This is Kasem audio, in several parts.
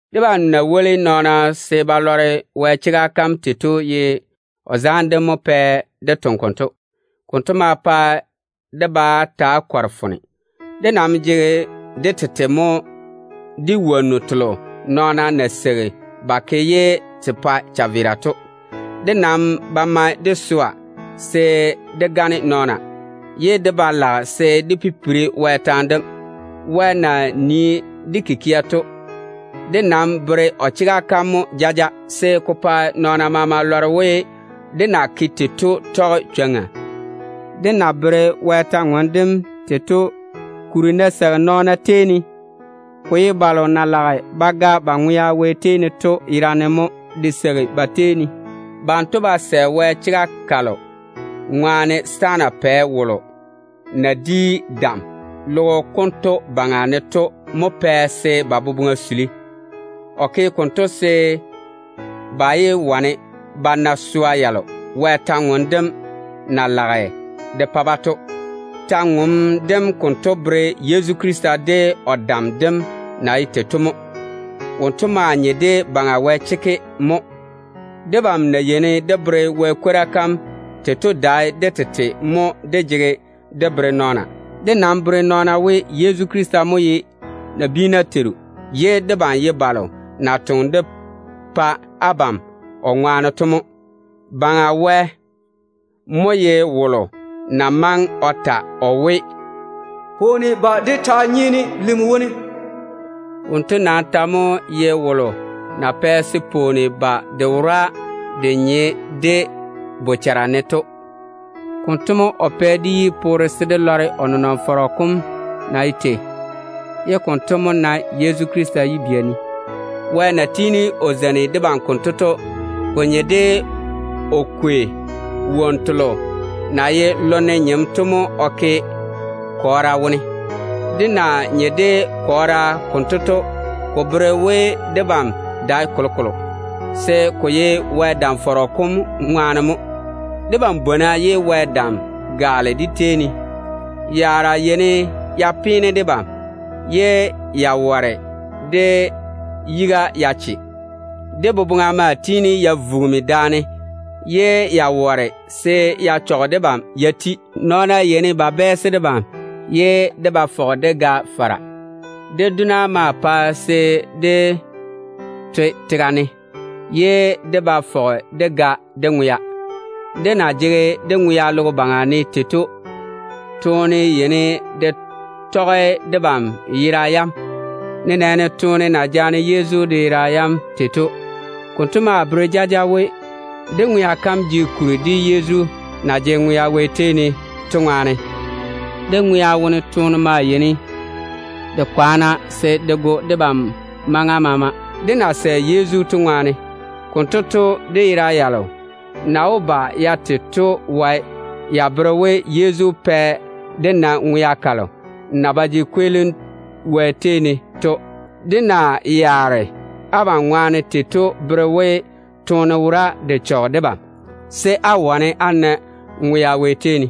Debam na woli nɔɔna se ba lɔre Wɛ chega kam tei to ye o zaane dem mo pɛ dé toŋe konto. Konto mo pɛ dé vɔna bá pare. Dé nam chuli wonnu telo nɔɔna na seigi ba ke ye te pa chaveera to. Dé ba tɔge swa baŋa dé gane nɔɔna, ye dé ba lage se dé pipiri Wɛ taane dem. Wɛ na nii dé kikia to, dé nam bere o chega kam mo jaja, se ko pa nɔɔna maama lɔre we, dé na ke tei to tɔge chwoŋa. Dé na tɔɔle Wɛ kwor-ywoŋa kam tei to kuri ná seigi nɔɔna tei ne, ko ye balo na lage ba ga ba ŋwea Wɛ tei ne to yerane mo ka seigi ba tei ne. Banto ve Wɛ chega kam, kolo ŋwaane setaana pɛ wolo na di dam logo konto baŋa ne to mo pɛ se ba boboŋa kwaale. O ke konto se ba yé wane ba na swa yalo Wɛ kwor-ywoŋa kam na lage ka pa-ba to. Kwora kam konto bere Yezu Krista de o dam dem na ye tei to mo. Wonto mo jege Baŋa Wɛ nyenyego chekke. Debam na yeini dé tɔɔle Wɛ kwora kam tei to dae dé tete mo dé jege dé bere nɔɔna. Dé nam bere nɔɔna we, Yezu Krista mo ye nabiina Teiru, ye debam ye balo na toŋe dé pa abam o ŋwaane to mo. Baŋa Wɛ mo ye wolo na maŋe o ta o we, “Pwooni ba de taa nyeene lim wone”. Wonto nam ta mo ye wolo na pɛ se pwooni ba de wora de nye dé bochara ne to. Konto mo o pɛ dé yi poore se dé lɔre o nenɔŋ-fɔrɔ kom na ye tei, ye konto mo nae Yezu Krista yibia ne. Wɛ na tiini o zeini debam konto to, ko nye de o kwei wonnu telo na ye lonne nyem to mo o ke kɔɔra wone. Dé na nye de kɔɔra konto to, ko bere we debam dae kolokolo, se ko ye Wɛ dam-fɔrɔ kom ŋwaane mo dé toŋa. Yaara yeini ya peene debam, ye ya ware dé yiga ya che. Dé boboŋa maa tiini ya vugimi, ye ya ware se ya pa dé vɔna pare. Nɔɔna yeini ba bɛɛse debam, ye dé ba fɔge dé gɛ fara. Dé dona maa pae se dé toe tega ne, ye dé ba fɔge dé gɛ dé ŋwea. Dé na jege dé ŋwea logo baŋa ne tei to, toone yeini de tɔge debam yera yam, nenɛɛne toone na jaane Yezu de yera yam tei to. Konto maa bere jaja we, dé ŋwea kam jege kuri, Yezu na jege ŋwea Wɛ tei ne to ŋwaane. Dé ŋwea wone toone maa yeini de kwaana se de go debam maŋa maama, dé na sɛ Yezu to ŋwaane. Konto to, dé yera yalo na wó ba ya te to wae ya bere we, Yezu pɛ dé na ŋwea kalo na ba jege kweelim Wɛ tei ne to. Dé na yaare abam ŋwaane tei to bere we, toone wora de chɔge debam, se ko pa abam wane á na ŋwea Wɛ tei ne.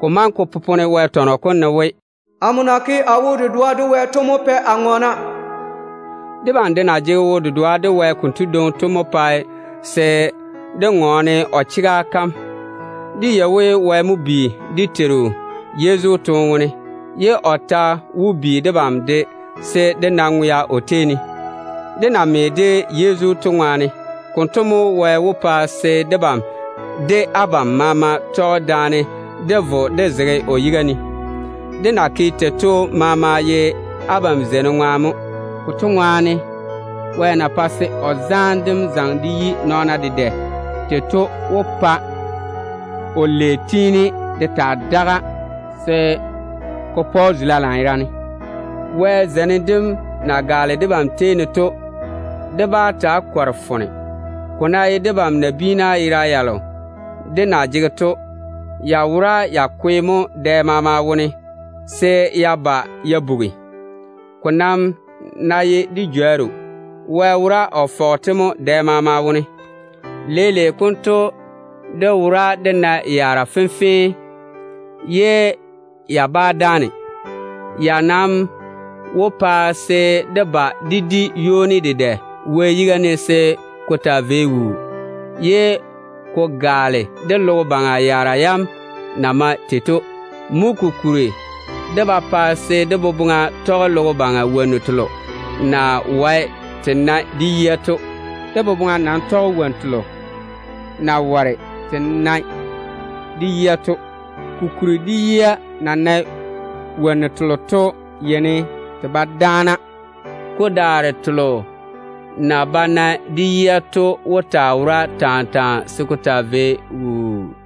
Ko maŋe ko popone Wɛ tɔnɔ kom ne we, “Amo na ke a wo-dedoa de Wɛ to mo pɛ a ŋɔɔna.” Debam de na jege wo-dedoa de Wɛ konto dwoŋi to mo pae dé ŋɔɔne o chega kam. Dé yei we, Wɛ mo bi dé Teiru Yezu toone wone, ye o ta wó bi debam de se dé na ŋwea o tei ne, dé na me de Yezu to ŋwaane. Konto mo Wɛ wó pa se debam de abam maama tɔge daane dé vo dé zege o yiga ne. Dé na ke tei to maama ye abam zeinim ŋwaane mo. Konto ŋwaane, Wɛ na pae se o zaane dem zaŋe de yi nɔɔna dedɛ tei to mo pae se ba ke o lei dedɛ, se ko pa o jwoŋi zula lanyerane. Wɛ zeinim dem na gaale debam tei ne to, dé vɔna bá pare. Ko ná ye debam nabiina yera yalo dé na jege to, ya wora ya kwe mo dɛ maama wone se ya ba ya bugi. Ko nam ná ye dé jworru, Wɛ wora o fɔge-te mo dɛ maama. Leile konto dé wora dé nae yaara fenfee, ye ya bá dáane. Ya nam wó pa se dé ba dé di ywoni dedɛ Wɛ yiga ne se ko taa vei wuu, ye ko gaale dé logo baŋa yaara yam na mae tei to. Mo kokuri dé ba pae se dé boboŋa tɔge logo baŋa wonnu telo na wae te nae de yia to. Dé boboŋa nam tɔge wonnu telo na ware te nae de yia to. Kokuri dé yia na nae wonnu telo to yeini te ba dáana. Ko daare telo na ba nae de yia to wó taa wora taa taa se ko taa vei wuu.